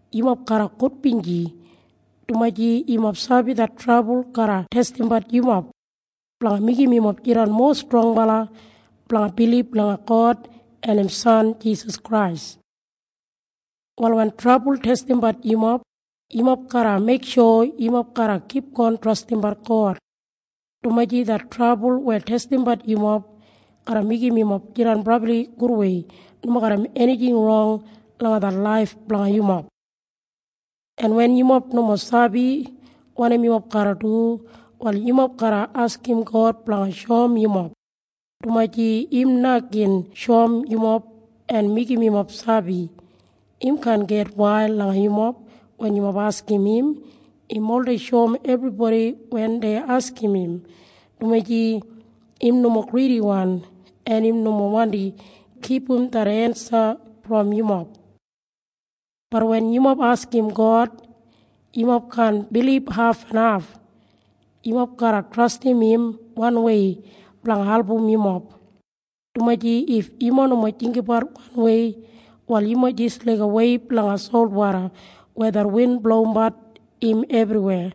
Yumob garra gudbinji, dumaji yumob sabi det trabul garra testimbat yumob, blanga meigim yumob jidan mowa strongbala blanga bilib langa God en im san Jisas Krais. Wal wen trabul testimbat yumob, yumob garra meiksho yumob garra kipgon trastimbat God, dumaji det trabul weya testimbat yumob garra meigim yumob jidan brabli gudwei nomo garram enijing rong langa det laif blanga yumob. En wen yumob nomo sabi wanim yumob garra du, wal yumob garra askim God blanga shoum yumob, dumaji im na gin shoum yumob en meigim yumob sabi. Im kaan gitwail langa yumob wen yumob askim im. Im oldei shoum ebribodi wen dei askim im, dumaji im nomo gridiwan en im nomo wandi kipum det ensa brom yumob. Bat wen yumob askim God, yumob kaan bilib hafenhaf. Yumob garra trastim im wanwei blanga album yumob, dumaji if yumob nomo jinggabat wanwei, wal yumob jis laiga weib langa solwoda weya det win blowimbat im ebriwei.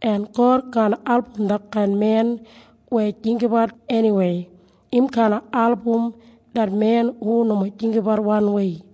En God kaan album detkain men weya jinggabat eniwei. Im kaan album det men hu nomo jinggabat wanwei.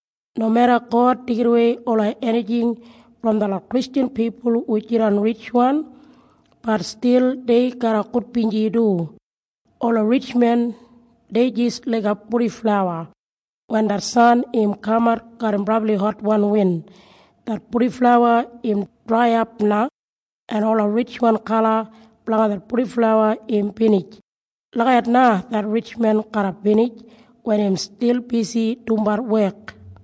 Nomeda God deigidawei ola enijing brom detlot Kristjan pipul hu jidan ritjwan, bat stil dei garra gudbinji du. Ola ritjmen dei jis laiga purdiflawa. Wen det san im kamat garram brabli hotwan win, det purdiflawa im draiyap na, en ola ritjwan kala blanga det purdiflawa im binij. Lagijat na det ritjmen garra binij wen im stil bisi dumbat wek.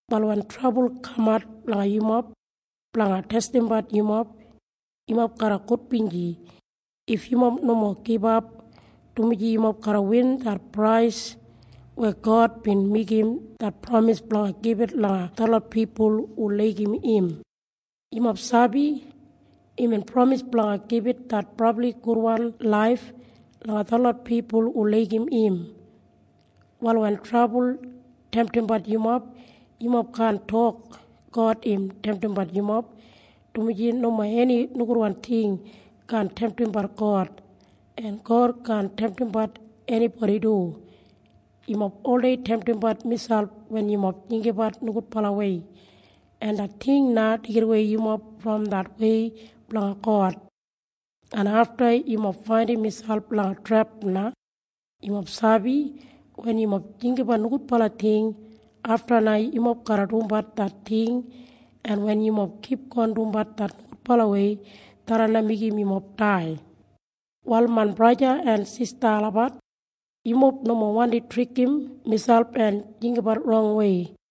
Wal wen trabul kamat langa yumob blanga testimbat yumob, yumob garra gudbinji if yumob nomo gibap, dumaji yumob garra win det prais weya God bin meigim det pramis blanga gibit langa detlot pipul hu laigim im. Yumob sabi? Imbin pramis blanga gibit det brabli gudwan laif langa detlot pipul hu laigim im. Wal wen trabul temtimbat yumob, yumob kaan tok God im temtimbat yumob, dumaji nomo eni nogudwan ting kaan temtimbat God, en God kaan temtimbat enibodi du. Yumob oldei temtimbat miselp wen yumob jinggabat nogudbalawei, en det ting na deigidawei yumob brom det wei blanga God, en afta yumob faindim miselp langa trep na. Yumob sabi? Wen yumob jinggabat nogudbala ting, afta na yumob garra dumbat det ting, en wen yumob kipgon dumbat det nogudbalawei, tharran na meigim yumob dai. Wal main braja en sista olabat, yumob nomo wandi trikim miselp en jinggabat rongwei.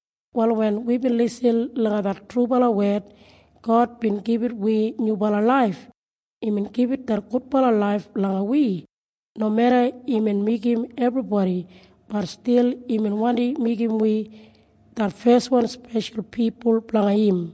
Wal wen wibin lisin langa det trubala wed, God bin gibit wi nyubala laif. Imbin gibit det gudbala laif langa wi. Nomeda imbin meigim ebribodi, bat stil imbin wandi meigim wi det feswan speshal pipul blanga im.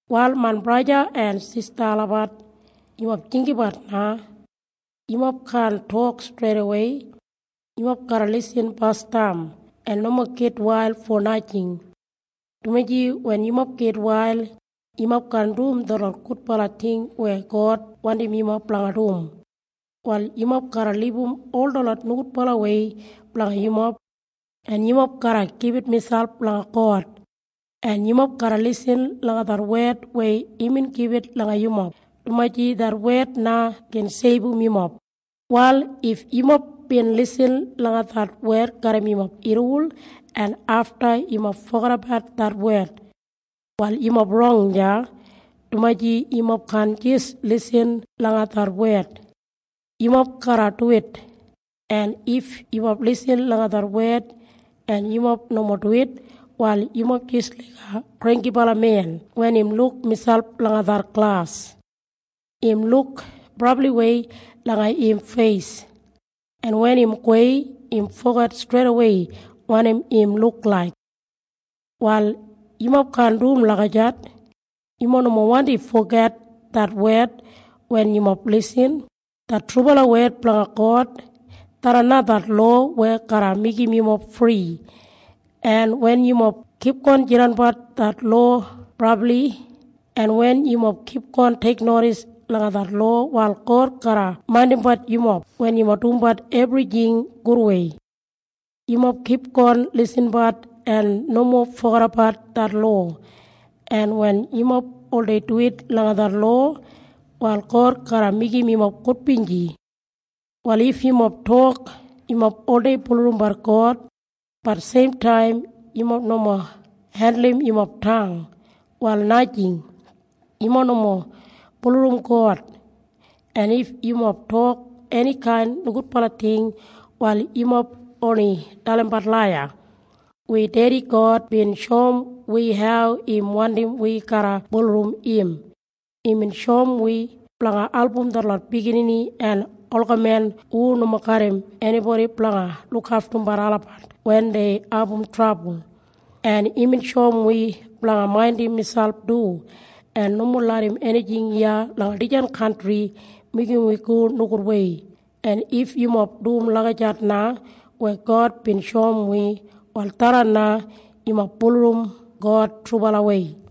Wal main braja en sista olabat, yumob jinggabat na. Yumob kaan tok streidawei. Yumob garra lisin basdam en nomo gitwail fo najing, dumaji wen yumob gitwail, yumob kaan dum detlot gudbala ting weya God wandim yumob blanga dum. Wal yumob garra libum ol detlot nogudbalawei blanga yumob, en yumob garra gibit miselp langa God, en yumob garra lisin langa det wed weya imbin gibit langa yumob, dumaji det wed na gin seibum yumob. Wal if yumob bin lisin langa det wed garram yumob irriwol en afta yumob fogedabat det wed, wal yumob rong deya, dumaji yumob kaan jis lisin langa det wed, yumob garra duwit. En if yumob lisin langa det wed en yumob nomo duwit, wal yumob jis laiga granggibala men wen im luk miselp langa det glas. Im luk brabliwei langa im feis, en wen im gowei, im foget streidawei wanim im luk laik. Wal yumob kaan dum lagijat. Yumob nomo wandi foget det wed wen yumob lisin. Det trubala wed blanga God, tharran na det lowa weya garra meigim yumob fri. En wen yumob kipgon jinggabat det lowa brabli, en wen yumob kipgon teiknodis langa det lowa, wal God garra maindimbat yumob wen yumob dumbat ebrijing gudwei. Yumob kipgon lisinbat en nomo fogedabat det lowa, en wen yumob oldei duwit langa det lowa, wal God garra meigim yumob gudbinji. Wal if yumob tok yumob oldei bulurrumbat God, bat seimtaim yumob nomo hendulum yumob tang, wal najing. Yumob nomo bulurrum God. En if yumob tok enikain nogudbala ting, wal yumob oni dalimbat laiya. Wi dedi God bin shoum wi hau im wandim wi garra bulurrum im. Imbin shoum wi blanga album detlot biginini en olgamen hu nomo garram enibodi blanga lukaftumbat olabat wen dei abum trabul. En imbin shoum wi blanga maindim miselp du en nomo larram enijing iya langa dijan kantri meigim wi go nogudwei. En if yumob dum lagijat na weya God bin shoum wi, wal tharran na yumob bulurrum God trubalawei.